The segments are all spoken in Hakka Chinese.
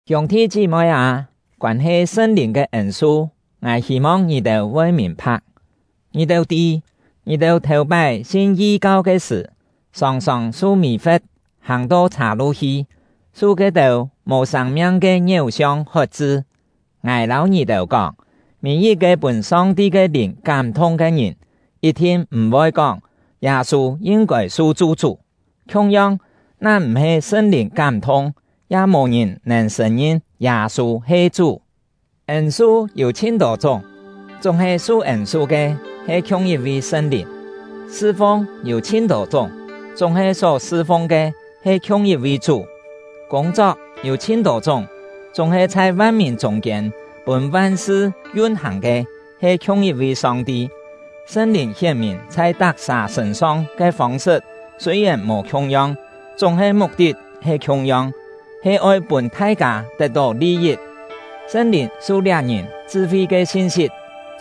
Hiûng-thi chí-moi â, koân-he Sṳn-Lìn ke ên-su, ngài hî-mong ngì-têu voi mìn-pha̍k. Ngì-têu tî, ngì-têu thèu-pái sin yi-kau ke sṳ̀, sòng-sòng su mì-fe̍t hàng-to chhâ-lu hi, su ke-têu mò sâng-miang ke ngiéu-siong hot-chṳ. Ngài lâu ngì-têu kóng, mî-yit-ke pûn Song-ti ke Lìn kám-thung ke ngìn yit-thin m̀-voi kóng “Yâ-sû yin-kôi su chu-chú”. Khiung-yong, na m̀-he Sṳn-Lìn kám-thung, ya mò ngìn nèn sṳ̀n-ngin “Yâ-sû he Chú”. Ên-su yû chhin-tô chúng, chúng-he su ên-su ke he khiung yit-vi Sṳn-Lìn. Sṳ-fung yû chhin-tô chúng, chúng-he só sṳ-fung ke he khiung yit-vi Chú. Kûng-chok yû chhin-tô chúng, chúng-he chhai van-mìn chûng-kiên pûn van-sṳ yun-hàng ke he khiung yit-vi Song-ti. Sṳn-Lìn hién-mìn chhai tak-sà sṳ̂n-song ke fông-sṳt sûi-yèn mò khiung-yong, chúng-he muk-tit he khiung-yong, he oi pûn thai-kâ tet-tó li-yit. Sṳn-Lìn su liá ngìn chṳ-fi ke sin-sit;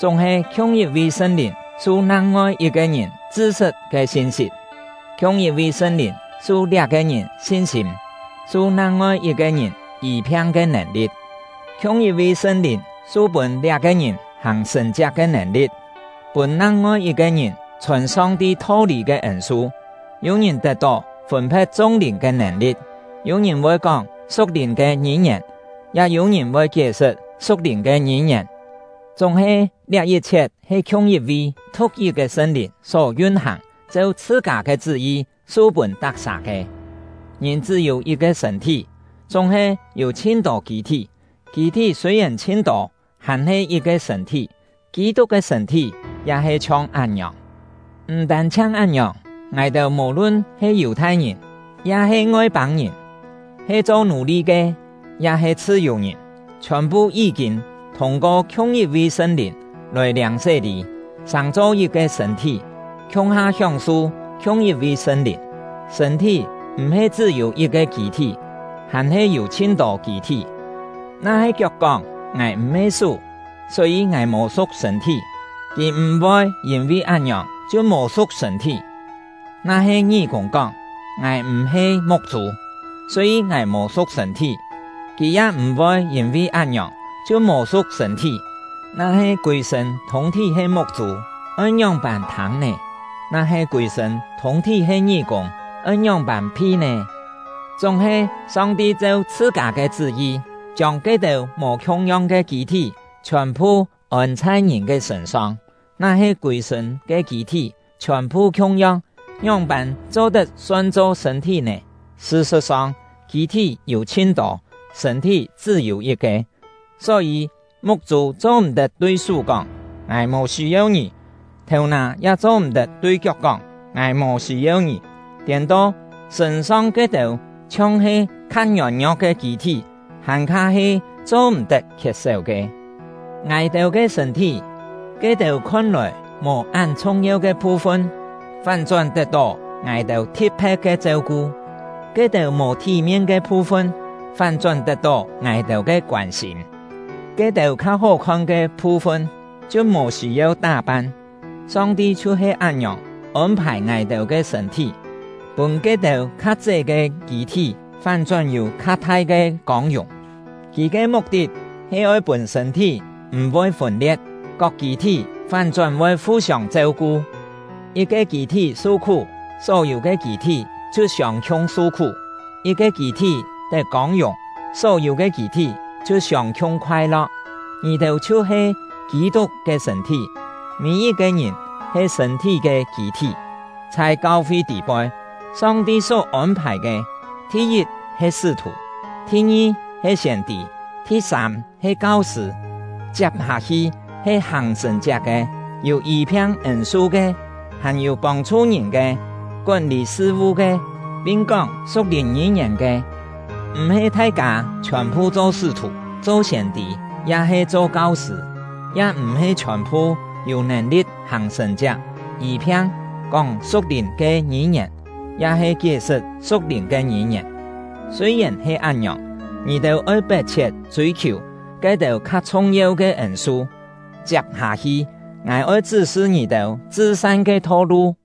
chúng-he khiung yit-vi Sṳn-Lìn su nang-ngoi yit-ke ngìn chṳ-sṳt ke sin-sit. Khiung yit-vi Sṳn-Lìn su liá-ke ngìn sin-sîm, su nang-ngoi yit-ke ngìn yî-phiang ke nèn-li̍t; khiung yit-vi Sṳn-Lìn su-pûn liá-ke ngìn hàng sṳ̀n-chiak ke nèn-li̍t, pûn nang-ngoi yit-ke ngìn chhòn Song-ti tho-lî ke ên-su; yû-ngìn tet-tó fûn-phe̍t chung lìn ke nèn-li̍t; yû-ngìn voi kóng su̍k-lìn ke ngî-ngièn; ya yû-ngìn voi kié-sṳt su̍k-lìn ke ngî-ngièn. Chúng-he, liá yit-chhiet he khiung yit-vi, thu̍k-yit ke Sṳn-Lìn só yun-hàng, cheu chhṳ-kâ ke chṳ́-yi su-pûn tak-sà ke. Ngìn chṳ́-yû yit-ke sṳ̂n-thí, chúng-he yû chhin-tô kî-thí; kî-thí sûi-yèn chhin-tô, hàn-he yit-ke sṳ̂n-thí. Kî-tuk ke sṳ̂n-thí ya he chhiong án-ngiòng. M̀ tân-chhiang án-ngiòng, ngài-têu mò-lun he Yù-thai-ngìn ya-he Ngoi-pâng-ngìn, he cho nù-li ke ya-he chhṳ-yù-ngìn, chhiòn-phu yí-kîn thûng-ko khiung yit-vi Sṳn-Lìn lòi liâng sé-lî, sàng-cho yit-ke sṳ̂n-thí, khiung-ha hióng-su khiung yit-vi Sṳn-Lìn. Sṳ̂n-thí m̀-he chṳ́-yû yit-ke kî-thí, hàn-he yû chhin-tô kî-thí. Na-he kiok kóng: “Ngài m̀-he sú, só-yî ngài mò su̍k sṳ̂n-thí”, kì m̀-voi yîn-vi án-ngiòng chhiu mò su̍k sṳ̂n-thí. Na-he ngí-kûng kóng: “Ngài m̀-he muk-chû, só-yî ngài mò su̍k sṳ̂n-thí”, kì ya m̀-voi yîn-vi án-ngiòng chhiu mò su̍k sṳ̂n-thí. Na-he kûi-sṳ̂n thûng-thí he muk-chû, oi ngióng-pân thâng nè? Na-he kûi-sṳ̂n thûng-thí he ngí-kûng, oi ngióng-pân phi nè? Chúng-he, Song-ti cheu chhṳ-kâ ke chṳ́-yi, chiông ke-têu mò khiung-yong ke kî-thí chhiòn-phu ôn chhai ngìn ke sṳ̂n-song. Na-he kûi-sṳ̂n ke kî-thí chhiòn-phu khiung-yong, ngióng-pân cho-tet son-cho sṳ̂n-thí nè? Sṳ-sṳ̍t-song, kî-thí yû chhin-tô, sṳ̂n-thí chṳ́-yû yit-ke. Só-yî, muk-chû cho-m̀-tet tui sú kóng: “Ngài mò sî-yeu ngì!” Thèu-nà ya cho-m̀-tet tui kiok kóng: “Ngài mò sî-yeu ngì!” Tiên-to, sṳ̂n-song ke-têu chhiong-he kha ngiôn-ngio̍k ke kî-thí, hàn-kha he cho-m̀-tet khiet-séu ke. Ngài-têu ke sṳ̂n-thí, ke-têu khon-lòi mò án chhung-yeu ke phu-fun, fán-chón tet-tó ngài-têu thi̍t-phe̍t ke cheu-ku; ke-têu mò thí-mien ke phu-fun, fán-chón tet-tó ngài-têu ke koân-sîm; ke-têu kha hó-khon ke phu-fun, chhiu mò sî-yeu tá-pan. Song-ti chhiu-he án-ngiòng ôn-phài ngài-têu ke sṳ̂n-thí, pûn ke-têu kha ché ke kî-thí fán-chón yû kha thai ke kông-yùng; Kì ke muk-tit he oi pûn sṳ̂n-thí m̀-voi fûn-lie̍t, kok kî-thí fán-chón voi fu-siông cheu-ku. Yit-ke kî-thí su-khú, só-yû ke kî-thí chhiu siông-khiung su-khú; yit-ke kî-thí tet kông-yùng, só-yû ke kî-thí chhiu siông-khiung khoai-lo̍k. Ngì-têu chhiu-he Kî-tuk ke sṳ̂n-thí, mî-yit-ke ngìn he sṳ̂n-thí ke kî-thí. Chhai kau-fi tî-poi, Song-ti só ôn-phài ke, thi-yit he sṳ́-thù, thi-ngi he siên-tî, thi-sâm he kau-sṳ̂; chiap-hâ-hi he hàng sṳ̀n-chiak ke, yû yî-phiang ên-su ke; hàn-yû pông-chhu ngìn ke, kón-lî sṳ-vu ke, pin kóng su̍k-lìn ngî-ngièn ke. M̀-he thai-kâ chhiòn-phu cho sṳ́-thù, cho siên-tî, ya-he cho kau-sṳ̂; ya m̀-he chhiòn-phu yû nèn-li̍t hàng sṳ̀n-chiak, yî-phiang, kóng su̍k-lìn ke ngî-ngièn, ya-he kié-sṳt su̍k-lìn ke ngî-ngièn. Sûi-yèn he án-ngiòng, ngì-têu oi pet-chhiet chûi-khiù ke-têu kha chhung-yeu ke ên-su. Chiap-hâ-hi, ngài oi chṳ́-sṳ ngì-têu chṳ-san ke tho-lu.